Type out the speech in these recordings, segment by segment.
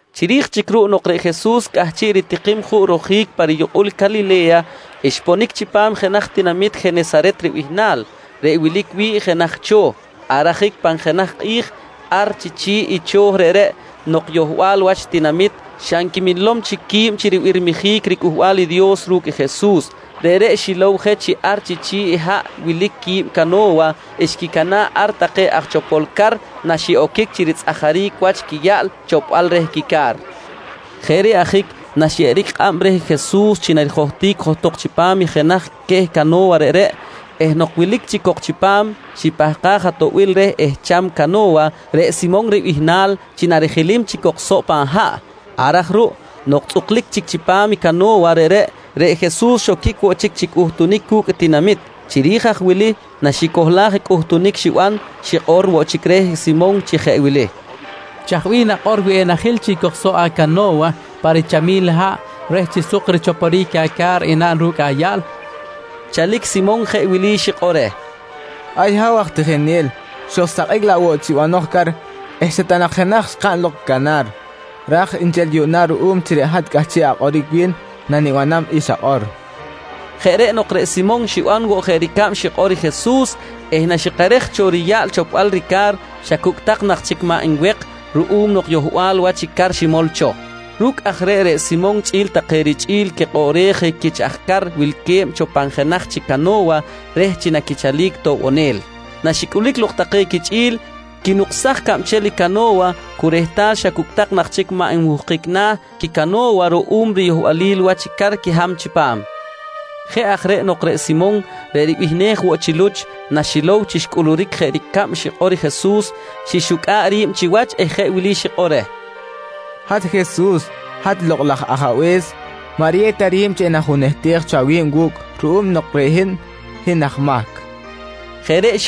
Chiri̱j chic ruꞌ nok reꞌ Jesus cꞌahchiꞌ ritikim juꞌ rojic pa riyukꞌul Calile̱ya, xponic chipam jenaj tinamit Jenesaret ribihnal reꞌ wilic wi̱ꞌ jenaj cho̱. Ar ajic pan jenaj kꞌi̱j, ar chi chi̱ꞌ i cho̱ reꞌreꞌ nok yohbal wach tinamit xa nquiminlom chic qui̱b chi ribirmijic riCꞌuhbal i Dios ru̱cꞌ Jesus, reꞌreꞌ xilow je chi ar chi chi̱ꞌ i haꞌ wilic qui̱b cano̱wa xquicana̱ꞌ ar take aj chopol car naxiꞌoquic chi ritzꞌajaric wach quiyaꞌl chopbal reh quica̱r. Jeꞌ reꞌ ajic naxyeꞌeric kꞌab reh i Jesus chi narijohtic johtok chipam jenaj queh cano̱wa reꞌreꞌ eh nok wilic chic cok chipam, xipahkaj atoꞌbil reh ehcham cano̱wa reꞌ Simon ribihnal chi narijilim chic cok soꞌ pan haꞌ. Ar aj ruꞌ nok tzꞌuklic chic chipam cano̱wa reꞌreꞌ, reꞌ Jesus xoquic woꞌ chic chi cꞌuhtunic cu̱cꞌ tinamit. Chiri̱j aj wili naxicohlaj i cꞌuhtunic xiban, xikꞌor woꞌ chic reh Simon chi jeꞌ wili: «Chaj bih nakꞌor wi enajil chic cok soꞌ acano̱wa pa richamil haꞌ reh chi suk richoporic aca̱r enaꞌn ru̱cꞌ ayaꞌl? nqui Jesus reh. Chalic Simon jeꞌ wili xikꞌor reh: «Ay Ha̱w aj tijinel! Xojsakꞌic laꞌ woꞌ chi banoj car eh xa ta nak jenaj xkaꞌn lok canar. Raj nchel yuꞌna ruꞌum chi reꞌ hat cꞌahchiꞌ akꞌoric wi̱n nanibanam i xakꞌor, nqui xikꞌor reh. Jeꞌ reꞌ nok reꞌ Simon xiban woꞌ jeꞌ ricab xikꞌor i Jesus eh naxikerej cho riyaꞌl chopbal rica̱r, xa cucꞌ tak nak chic maꞌ nwek ruꞌum nok yohbal wach i car ximol cho. Ru̱cꞌ aj reꞌ, reꞌ Simon chꞌi̱l take richꞌi̱l quikꞌoꞌrej je quich aj car wilque̱b cho pan jenaj chic cano̱wa reh chi naquichalic toꞌbonel. Naxicꞌulic lok take quichꞌi̱l, quinuksaj cabchel i cano̱wa cu rehtal xa cucꞌ tak nak chic maꞌ nmuhkic na̱ quicano̱wa ruꞌum riyohbalil wach car quiham chipam. Jeꞌ aj reꞌ nok reꞌ Simon reꞌ ribihnej woꞌ chi Luch, naxilow chi xcꞌuluric jeꞌ ricab xikꞌor i Jesus, xixucꞌa̱ꞌ ri̱b chiwach eh jeꞌ wili xikꞌor reh: «Hat Jesus, hat Lokꞌ laj Ajabe̱s. Maꞌ riyew ta ri̱b chi enajunehtej cho awi̱b wu̱cꞌ ruꞌum nok reꞌ hin, hin aj mahc, nqui reh.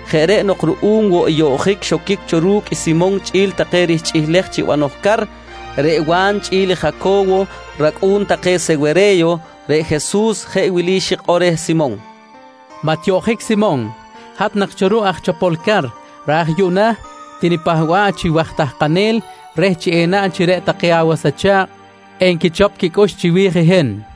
Jeꞌ reꞌ nok ruꞌum woꞌ i yoꞌjic xoquic cho ru̱cꞌ Simon chꞌi̱l take rihchꞌilej chi banoj car, reꞌ Wa̱n chꞌi̱l i Jaco̱wo racꞌu̱n take i Sewere̱yo, reꞌ Jesus jeꞌ wili xikꞌor reh Simon: «Maꞌ tiyoꞌjic Simon. Hat nak cho ruꞌ aj chopol car, raj yuꞌna tinipahba̱ꞌ chi waj tahkanel reh chi enaꞌn chi reꞌ take awas acha̱kꞌ enquichop quicꞌux chiwi̱j i hin, nqui Jesus reh.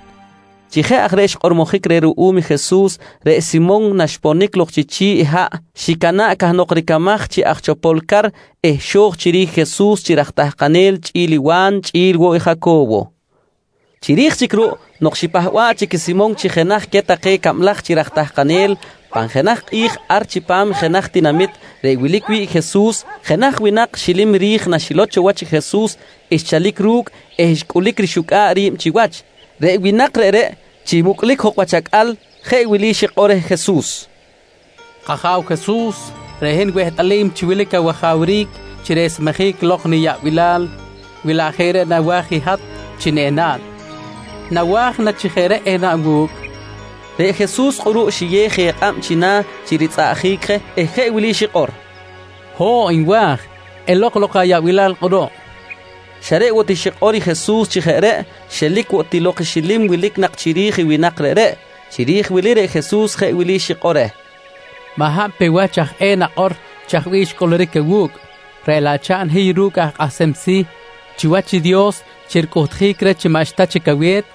Chi jeꞌ aj reꞌ xkꞌormojic reh ruꞌum i Jesus, reꞌ Simon naxponic lok chi chi̱ꞌ haꞌ xicana̱ꞌ cahnok ricamaj chi aj chopol car eh xo̱j chiri̱j i Jesus chi raj tahkanel chꞌi̱l i Wa̱n chꞌi̱l woꞌ i Jaco̱wo. Chiri̱j chic ruꞌ nok xipahba̱ꞌ chic i Simon chi jenaj queh take cablaj chi raj tahkanel, pan jenaj kꞌi̱j ar chipam jenaj tinamit reꞌ wilic wi̱ꞌ i Jesus, jenaj winak xilim ri̱j naxilow cho wach i Jesus xchalic ru̱cꞌ eh xcꞌulic rixucꞌa̱ꞌ ri̱b chiwach. Reꞌ winak reꞌreꞌ chi mucꞌlic jok wach acꞌal jeꞌ wili xikꞌor reh Jesus: «K-Aja̱w Jesus, reꞌ hin wehtꞌalim chi wilic awajawric chi resmejic lok niyaꞌbilal wi laꞌ jeꞌ reꞌ nawa̱j i hat chi enaꞌn. Nawa̱j na chi jeꞌ reꞌ enaꞌn wu̱cꞌ? nqui reh. Reꞌ Jesus kꞌuruꞌ xiyew je kꞌab china̱ chi ritzꞌaꞌjic je eh jeꞌ wili xikꞌor: «Ho̱ꞌ nwa̱j! Elok lok ayaꞌbilal kꞌuruꞌ, nqui reh. Xa reꞌ woꞌ ti xikꞌor i Jesus chi jeꞌ reꞌ, xelic woꞌ ti lok i xilim wilic nak chiri̱j i winak reꞌreꞌ. Chiri̱j wili reꞌ Jesus jeꞌ wili xikꞌor reh: «Maꞌ hab pe wach aj eh nakꞌor chaj bih xcꞌuluric awu̱cꞌ, reꞌ laꞌ chaꞌn hiy ru̱cꞌ aj kꞌahsem si̱ chiwach i Dios chi ricꞌuhtjic reh chi maꞌxta chic awe̱t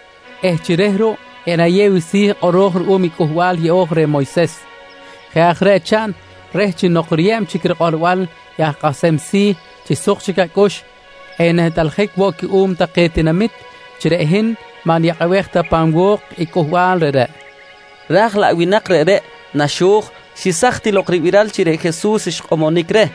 eh chi reh ruꞌ enayew i si̱ kꞌoro̱j ruꞌum i Cꞌuhbal Yeꞌo̱j reh i Moyses. Jeꞌ aj reꞌ chaꞌn reh chi nok riyeb chic rikꞌorbal i aj kꞌahsem si̱ chi suk chic acꞌux enehtꞌaljic woꞌ cuꞌum take tinamit chi reꞌ hin maꞌ niyakꞌabej ta pan wo̱k i cꞌuhbal reꞌreꞌ, nqui xikꞌor reh. Raj laꞌ winak reꞌreꞌ naxo̱j, xesaj ti lok ribiral chi reꞌ Jesus xkꞌomonic reh.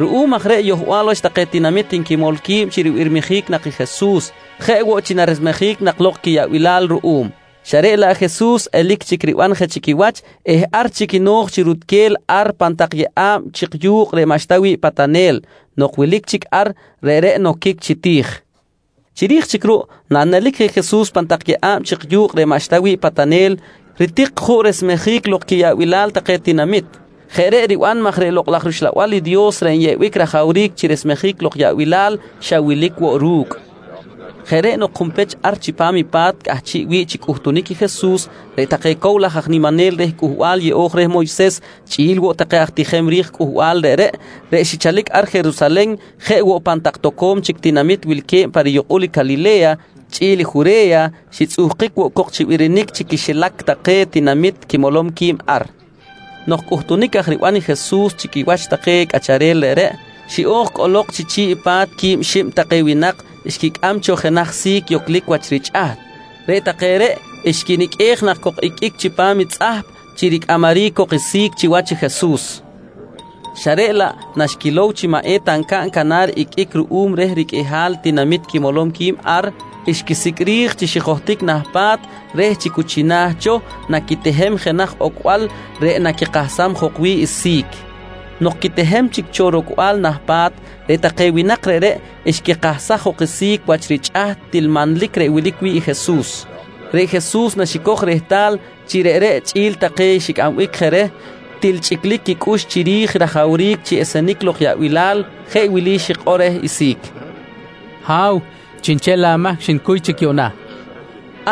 Ruꞌum aj reꞌ yohbal wach take tinamit nquimol qui̱b chi ribirmijic nak i Jesus, jeꞌ woꞌ chi naresmejic nak lok quiyaꞌbilal ruꞌum, xa reꞌ laꞌ Jesus, elic chic riban je chi quiwach eh ar chic no̱j chi rutquel ar pan tak yeꞌa̱b chik yu̱kꞌ reꞌ maꞌxta wi̱ꞌ patanel. Nok wilic chic ar, reꞌreꞌ noquic chi ti̱j. Chiri̱j chic ruꞌ, nanelic je Jesus pan tak yeꞌa̱b chik yu̱kꞌ reꞌ maꞌxta wi̱ꞌ patanel, ritik juꞌ resmejic lok quiyaꞌbilal take tinamit. Jeꞌ reꞌ riban maj reꞌ Lokꞌ laj rUxlabal i Dios reꞌ nyeꞌbic rajawric chi resmejic lok yaꞌbilal, xa wilic woꞌ ru̱cꞌ. Jeꞌ reꞌ nok junpech ar chipam i pa̱t cꞌahchiꞌ wi̱ꞌ chi cꞌuhtunic i Jesus, reꞌ take cow laj aj niminel reh Cꞌuhbal Yeꞌo̱j reh Moyses chꞌi̱l woꞌ take aj tijem ri̱j cꞌuhbal reꞌreꞌ, reꞌ xichalic ar Jerusalen jeꞌ woꞌ pan tak toco̱m chic tinamit wilque̱b pa riyukꞌul Calile̱ya chꞌi̱l Jure̱ya, xitzꞌuhkic woꞌ cok chi birinic chi quixilac take tinamit quimolom qui̱b ar. Nok cꞌuhtunic aj riban i Jesus chi quiwach take cꞌacharel reꞌreꞌ, xiꞌo̱j cꞌolok chi chi̱ꞌ i pa̱t quib xib take winak xquicꞌam cho jenaj si̱c yoclic wach richꞌaht. Reꞌ take xquiniqꞌuej nak cok iqꞌuic chipam i tzꞌahp chi ricꞌamaric cok i si̱c chiwach i Jesus xa reꞌ laꞌ naxquilow chi maꞌ eta ncaꞌn canar iqꞌuic ruꞌum reh riqꞌuihal i tinamit quimolom qui̱b ar, xquisicꞌ ri̱j chi xijohtic nah pa̱t reh chi cu china̱ cho naquitehem jenaj ocbal reꞌ naquikahsam jok wi̱ꞌ i si̱c. Nok quitehem chic cho rocbal nah pa̱t, reꞌ take winak reꞌreꞌ xquikahsaj jok i si̱c wach richꞌaht til manlic reꞌ wilic wi̱ꞌ i Jesus. Reꞌ Jesus naxicoj rehtal chi reꞌreꞌ chꞌi̱l take xicꞌambic je reh, til chꞌiclic quicꞌux chiri̱j i rajawric chi esenic lok yaꞌbilal, jeꞌ wili xikꞌor reh i si̱c: «Ha̱w, chiꞌnchel amahc xnicuy chic yuꞌna, nqui reh.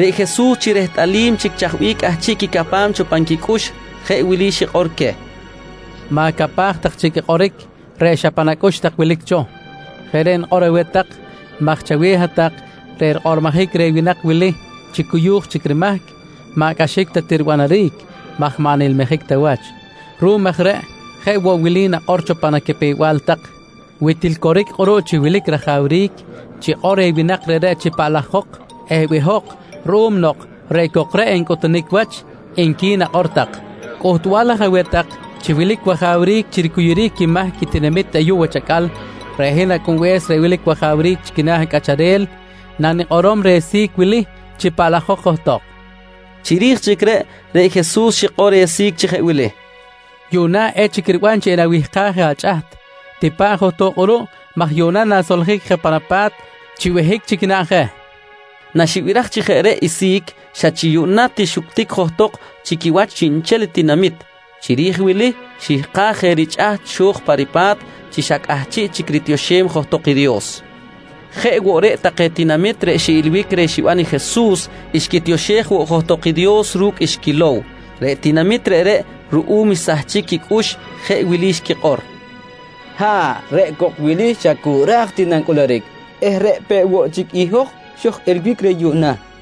Reꞌ Jesus chi rehtꞌalim chic chaj bih cꞌahchiꞌ quicapam cho pan quicꞌux, jeꞌ wili xikꞌor queh: «Ma̱capaj tak chic i kꞌoric reꞌ xa pan acꞌux tak wilic cho. Jeꞌ reꞌ nikꞌor aweh tak maj chaweh hat-tak reꞌ rikꞌormojic reh winak wili chi cuyu̱j chic rimahc maꞌ cꞌaxic ta ti ribanaric maj maꞌ nilmijic ta wach. Ruꞌum aj reꞌ jeꞌ woꞌ wili nakꞌor cho pan acapew-bal tak: ‹Wi til coric kꞌuruꞌ chi wilic rajawric, chikꞌor reh winak reꞌreꞌ chi paꞌlajok eh behok ruꞌum nok reꞌ cok reꞌ ncꞌuhtunic wach, nqui nakꞌor tak. «Cꞌuhtbal aj aweh tak chi wilic wajawric chi ricuyuric quimahc i tinamit ayuꞌ wach acꞌal, reꞌ hin Acꞌunbe̱s reꞌ wilic wajawric chi quina̱ cꞌacharel nanikꞌorom reh si̱c wili chi paꞌlajok johtok, nqui queh. Chiri̱j chic reꞌ, reꞌ Jesus xikꞌor reh si̱c chi jeꞌ wili: «Ha̱w, yuꞌna echic riban chi enawihkaj je achꞌaht. Tipa̱ꞌ johtok kꞌuruꞌ maj yuꞌna na̱soljic je pan apa̱t chi behic chic naꞌn je, nqui Jesus reh. Naxibiraj chi jeꞌ reꞌ i si̱c, xa chi yuꞌna ti xuctic johtok chi quiwach chiꞌnchel i tinamit. Chiri̱j wili xihkaj je richꞌaht xo̱j pa ripa̱t chi xa cꞌahchiꞌ chic ritioxem johtok i Dios. Jeꞌ woꞌ reꞌ take tinamit reꞌ xiꞌilbic reh xiban i Jesus, xquitioxej woꞌ johtok i Dios ru̱cꞌ xquilow. Reꞌ tinamit reꞌreꞌ ruꞌum xsahchic quicꞌux jeꞌ wili xquikꞌor: «Ha̱ꞌ, reꞌ cok wili xa cu ra̱j ti nancꞌuluric eh reꞌ peꞌ woꞌ chic i hoj xoj-ilbic reh yuꞌna, nqui take.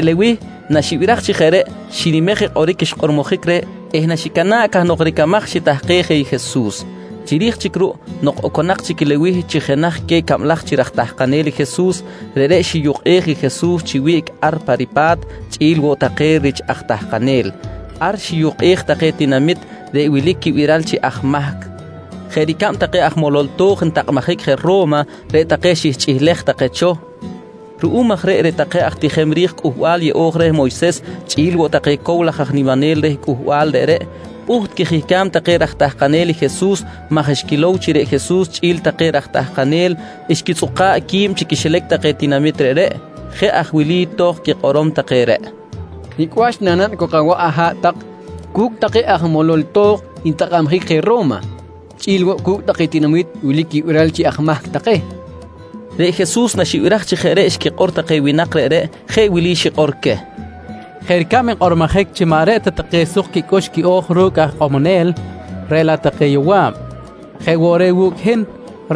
Reꞌ Lewih, naxibiraj chi jeꞌ reꞌ, xinimej i kꞌoric xkꞌormojic reh eh naxicana̱ꞌ cahnok ricamaj xitahkej je i Jesus. Chiri̱j chic ruꞌ, nok oconak chic i Lewih chi jenaj queh cablaj chi raj tahkanel i Jesus, reꞌreꞌ xiyukꞌej i Jesus chi wiꞌc ar pa ripa̱t chꞌi̱l woꞌ take rich aj tahkanel. Ar xiyukꞌej take tinamit reꞌ wilic quibiral chi aj mahc jeꞌ ricab take aj molol to̱j ntakꞌabjic je Ro̱ma, reꞌ take xihchꞌilej take cho. Ruꞌum aj reꞌ, reꞌ take aj tijem ri̱j Cꞌuhbal Yeꞌo̱j reh Moyses chꞌi̱l woꞌ take cow laj aj niminel reh cꞌuhbal reꞌreꞌ, pꞌuht quijihcam take raj tahkanel i Jesus maj xquilow chi reꞌ Jesus chꞌi̱l take raj tahkanel xquitzꞌuka̱ꞌ qui̱b chi quixilac take tinamit reꞌreꞌ. Jeꞌ aj wili tohkꞌ quikꞌorom take reꞌ: «Nicꞌ wach nanaꞌn cok awaꞌ aha̱ꞌ tak cu̱cꞌ take aj molol to̱j ntakꞌabjic je Ro̱ma chꞌi̱l woꞌ cu̱cꞌ take tinamit wilic quibiral chi aj mahc take? nqui take reh Jesus. Reꞌ Jesus naxibiraj chi jeꞌ reꞌ xquikꞌor take winak reꞌreꞌ, jeꞌ wili xikꞌor queh: «Jeꞌ ricab nkꞌormojic chi maꞌ reꞌ ta take suk quicꞌux quiꞌo̱j ru̱cꞌ aj ikꞌomonel reꞌ laꞌ take yowaꞌi̱b, jeꞌ woꞌ reꞌ wu̱cꞌ i hin,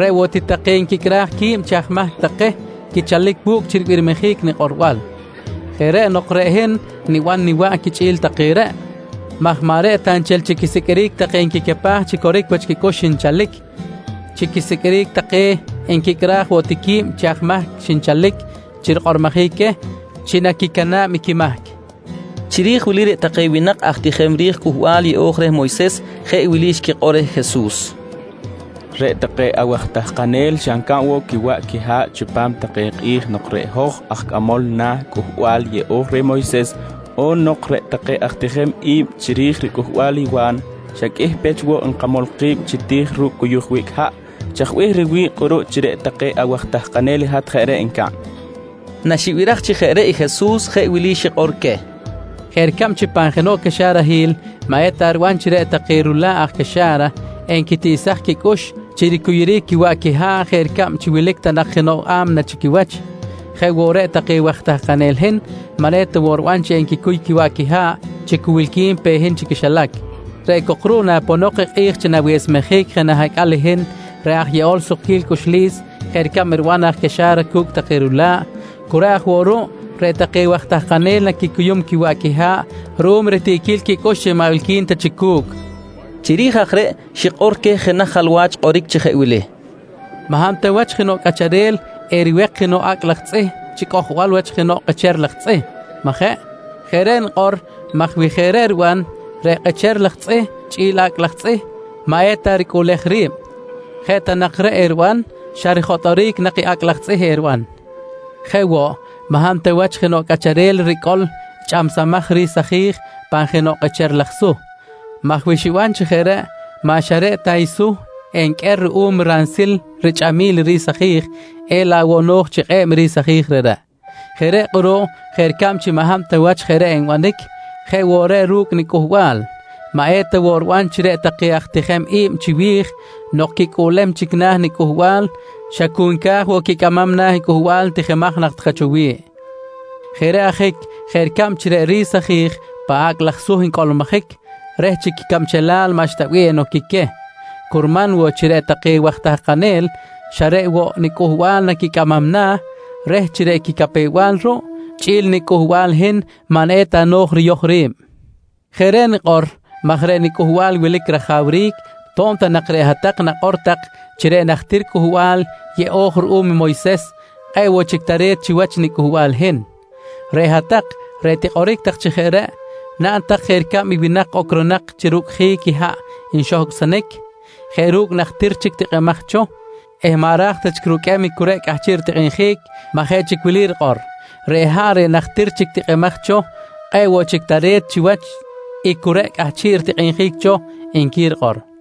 reꞌ woꞌ ti take nquicꞌraj qui̱b chi aj mahc take quichalic wu̱cꞌ chi ribirmijic nikꞌorbal. Jeꞌ reꞌ nok reꞌ hin niban niwaꞌ quichꞌi̱l take reꞌ maj maꞌ reꞌ ta nchel chi risiqꞌuiric take nquicapaj chi coric wach quicꞌux xinchalic, chi quisiqꞌuiric take nquicꞌraj woꞌ ti qui̱b chi aj mahc xinchalic chi rikꞌormojic queh chi naquicana̱b i quimahc, nqui Jesus. Chiri̱j wili reꞌ take winak aj tijem ri̱j Cꞌuhbal Yeꞌo̱j reh Moyses, jeꞌ wili xquikꞌor reh Jesus: «Reꞌ take awaj tahkanel xa ncaꞌn woꞌ quiwaꞌ quiha̱ꞌ chipam take kꞌi̱j nok reꞌ hoj aj cꞌamol na̱ i Cꞌuhbal Yeꞌo̱j reh Moyses on nok reꞌ take aj tijem i̱b chiri̱j ricꞌuhbal i Wa̱n, xa qꞌuih pech woꞌ nkamol ki̱b chi ti̱j ru̱cꞌ cuyuj wiꞌc haꞌ. Chaj bih riwi̱ꞌ kꞌuruꞌ chi reꞌ take awaj tahkanel i hat jeꞌ reꞌ ncaꞌn? nqui take reh. Naxibiraj chi jeꞌ reꞌ i Jesus, jeꞌ wili xikꞌor queh: «Jeꞌ ricab chi pan jenoꞌ caxarahil maꞌ eta riban chi reꞌ take rula̱ꞌ aj caxa̱ra enquitiꞌsaj quicꞌux chi ricuyuric quiwaꞌ quiha̱ꞌ jeꞌ ricab chi wilic ta nak jenoꞌ a̱mna chi quiwach, jeꞌ woꞌ reꞌ take waj tahkanel i hin maꞌ eta woꞌ riban chi enquicuy quiwaꞌ quiha̱ꞌ chi cu wilqui̱n pe hin chi quixilac. Reꞌ cok ruꞌ, naponok i kꞌi̱j chi na̱wesmejic je nah acꞌal i hin reꞌ aj yeꞌol sukquil cꞌuxlis jeꞌ ricab riban aj caxa̱ra cu̱cꞌ take rula̱ꞌ, cu reꞌ aj woꞌ ruꞌ reꞌ take waj tahkanel naquicuyum quiwaꞌ quiha̱ꞌ ruꞌum ritiꞌquil quicꞌux chi maꞌ wilqui̱n ta chic cu̱cꞌ, nqui Jesus queh. Chiri̱j aj reꞌ, xikꞌor queh jenaj jalwach kꞌoric chi jeꞌ wili: «Maꞌ hab ta wach jenoꞌ cꞌacharel eriwek jenoꞌ acꞌ laj tzꞌih chi cꞌojbal wach jenoꞌ kꞌecher laj tzꞌih, majeꞌ? Jeꞌ reꞌ nikꞌor maj wi jeꞌ reꞌ riban, reꞌ kꞌecher laj tzꞌih chꞌi̱l acꞌ laj tzꞌih maꞌ eta ricꞌuꞌlej ri̱b. Jeꞌ ta nak reꞌ eriban, xa rijotꞌoric nak i acꞌ laj tzꞌih eriban. Jeꞌ woꞌ, maꞌ hab ta wach jenoꞌ cꞌacharel ricꞌol i chꞌamsamaj ri̱s aji̱j pan jenoꞌ kꞌecher laj suh maj wi xiban chi jeꞌ reꞌ, maꞌ xa reꞌ ta i suh enqꞌuer ruꞌum ransil richꞌamil i ri̱s aji̱j, elaꞌ woꞌ no̱j chi kꞌe̱b i ri̱s aji̱j reꞌreꞌ. Jeꞌ reꞌ kꞌuruꞌ jeꞌ ricab chi maꞌ hab ta wach jeꞌ reꞌ nbanic, jeꞌ woꞌ reꞌ ru̱cꞌ i nicꞌuhbal maꞌ eta woꞌ riban chi reꞌ take aj tijem i̱b chiwi̱j nok quicꞌuꞌlem chic na̱ nicꞌuhbal xa cu nca̱j woꞌ quicꞌamam na̱ i cꞌuhbal tijimaj nak take cho wi̱ꞌ. Jeꞌ reꞌ ajic jeꞌ ricab chi reꞌ ri̱s aji̱j pan acꞌ laj suh ncꞌolmojic reh chi quicabchelal maꞌxta bih enoquic queh, curman woꞌ chi reꞌ take waj tahkanel xa reꞌ woꞌ nicꞌuhbal naquicꞌamam na̱ reh chi reꞌ quicapew-bal ruꞌ chꞌi̱l i nicꞌuhbal i hin maꞌ eta no̱j riyoj ri̱b. Jeꞌ reꞌ nikꞌor maj reꞌ nicꞌuhbal wilic rajawric to̱b ta nak reꞌ hat-tak nakꞌor tak chi reꞌ najtir Cꞌuhbal Yeꞌo̱j ruꞌum Moyses kꞌe̱ꞌ woꞌ chic tare̱t chiwach nicꞌuhbal i hin. Reꞌ hat-tak reꞌ tikꞌoric tak reh chi jeꞌ reꞌ, naꞌn tak jeꞌ ricab i winak ocronak chi rucꞌjic i haꞌ nxohcꞌsonic jeꞌ ru̱cꞌ najtir chic tikꞌimaj cho eh maꞌ ra̱j ta chic ruqꞌuem i cu reꞌ cꞌahchiꞌ ritikꞌinjic maj jeꞌ chic wili rikꞌor: ‹Reꞌ haꞌ reꞌ najtir chic tikꞌimaj cho, kꞌe̱ꞌ woꞌ chic tare̱t chiwach i cu reꞌ cꞌahchiꞌ ritikꞌinjic cho, nqui rikꞌor, nqui Jesus queh cow laj aj niminel reꞌreꞌ.